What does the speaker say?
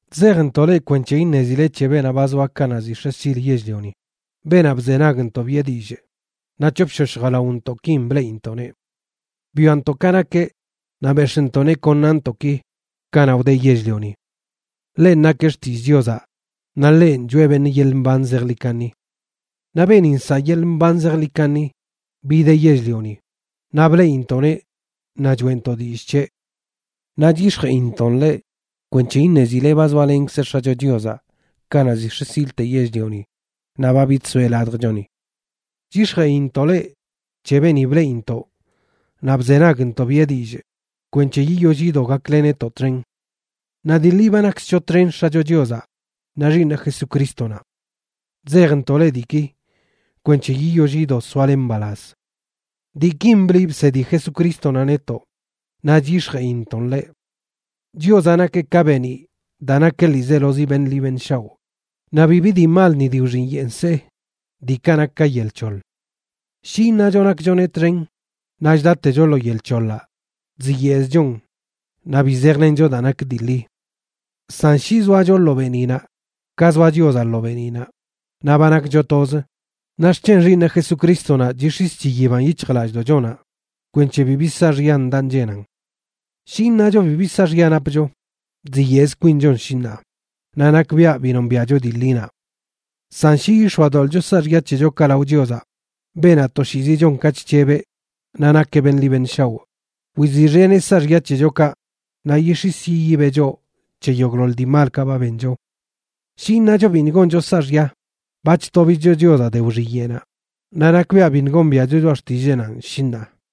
Chzejntoꞌ leꞌ kwenc̱he iṉezile c̱he beenaꞌ ba zoa kanaꞌ ziꞌ x̱e sil yell-lioni, beenaꞌ bzenagntoꞌ biꞌe dillꞌ naꞌ c̱hopshosh jalaontoꞌkin bleꞌintoꞌneꞌ. Bwiantoꞌ ka nakeꞌ naꞌ bex̱ꞌntoꞌneꞌ kon naꞌntoꞌki kanaꞌ wdeꞌ yell-lioni. Ḻenꞌ nakeꞌ Xtillꞌ Chiozaꞌ naꞌ ḻenꞌ choꞌe beṉꞌ yeḻꞌ mban zejḻi kaṉi. Naꞌ beeni nsaꞌ yeḻꞌ mban zejḻi kaṉi bideꞌ yell-lioni, naꞌ bleꞌintoꞌneꞌ naꞌ choeꞌntoꞌ dillꞌ c̱heꞌ. Naꞌ chyix̱jeꞌintoꞌn leꞌ kwenc̱he iṉezile ba zoalenkzeꞌ X̱acho Chiozaꞌ kanaꞌ ziꞌ x̱e silte yell-lioni naꞌ ba bidsoeꞌ ladjchoni. Chyix̱jeꞌintoꞌ leꞌ c̱he beeni bleꞌintoꞌ naꞌ bzenagntoꞌ biꞌe dillꞌ, kwenc̱he yiyoll yido gakle netoꞌ txen. Naꞌ dii ḻi ba nakkzcho txen X̱acho Chiozaꞌ naꞌ Xiiṉeꞌ Jesucrístonaꞌ. Chzejntoꞌ leꞌ diiki kwenc̱he yiyoll yido soale mbalaz. Diikin bliꞌ bsedi Jesucrístonaꞌ netoꞌ, naꞌ chyix̱jeꞌintoꞌn leꞌ: Chiozaꞌ nakeꞌ ka beeniꞌ daa nakeꞌ ḻiizelozi beṉꞌ ḻi beṉꞌ shaoꞌ, naꞌ bibi dii mal ni de wxiyeꞌ nsee, diikaꞌ nak ka yel c̱hoḻ. Shi iṉacho nakchoneꞌ txen naꞌ chdatecho lo yel c̱hoḻaꞌ, chziyeꞌzchon naꞌ bi zejlencho daa nak dii ḻi. San shi zoacho lo beeniꞌnaꞌ ka zoa Chiozaꞌ lo beeniꞌnaꞌ, naꞌ ba nakcho toz, naꞌ xc̱hen Xiiṉeꞌ Jesucrístonaꞌ chix̱is chiyiban yic̱hjlallꞌdoꞌchonaꞌ kwenc̱he bibi saaxya ndaꞌ nchenan. Shi iṉacho bibi saaxya napcho, chziyeꞌz kwinchon, shi ṉaa, naꞌ nakbiaꞌ bi nombiaꞌcho dii ḻinaꞌ. San shi yix̱oadoḻꞌcho saaxya c̱hechokaꞌ lao Chiozaꞌ, beenaꞌ toshiizi chon ka chc̱hebeꞌ naꞌ nakeꞌ beṉꞌ ḻi beṉꞌ shaoꞌ, wiziꞌxeneꞌ saaxya c̱hechokaꞌ naꞌ yix̱is yiyibeꞌ choꞌ c̱he yogꞌḻoḻ dii malkaꞌ ba bencho. Shi iṉacho biṉꞌ goncho saaxya, ba chtobicho Chiozaꞌ de wxiyeꞌnaꞌ, naꞌ nakbiaꞌ biṉꞌ gombiaꞌcho choꞌa xtilleenanꞌ, shi ṉaa.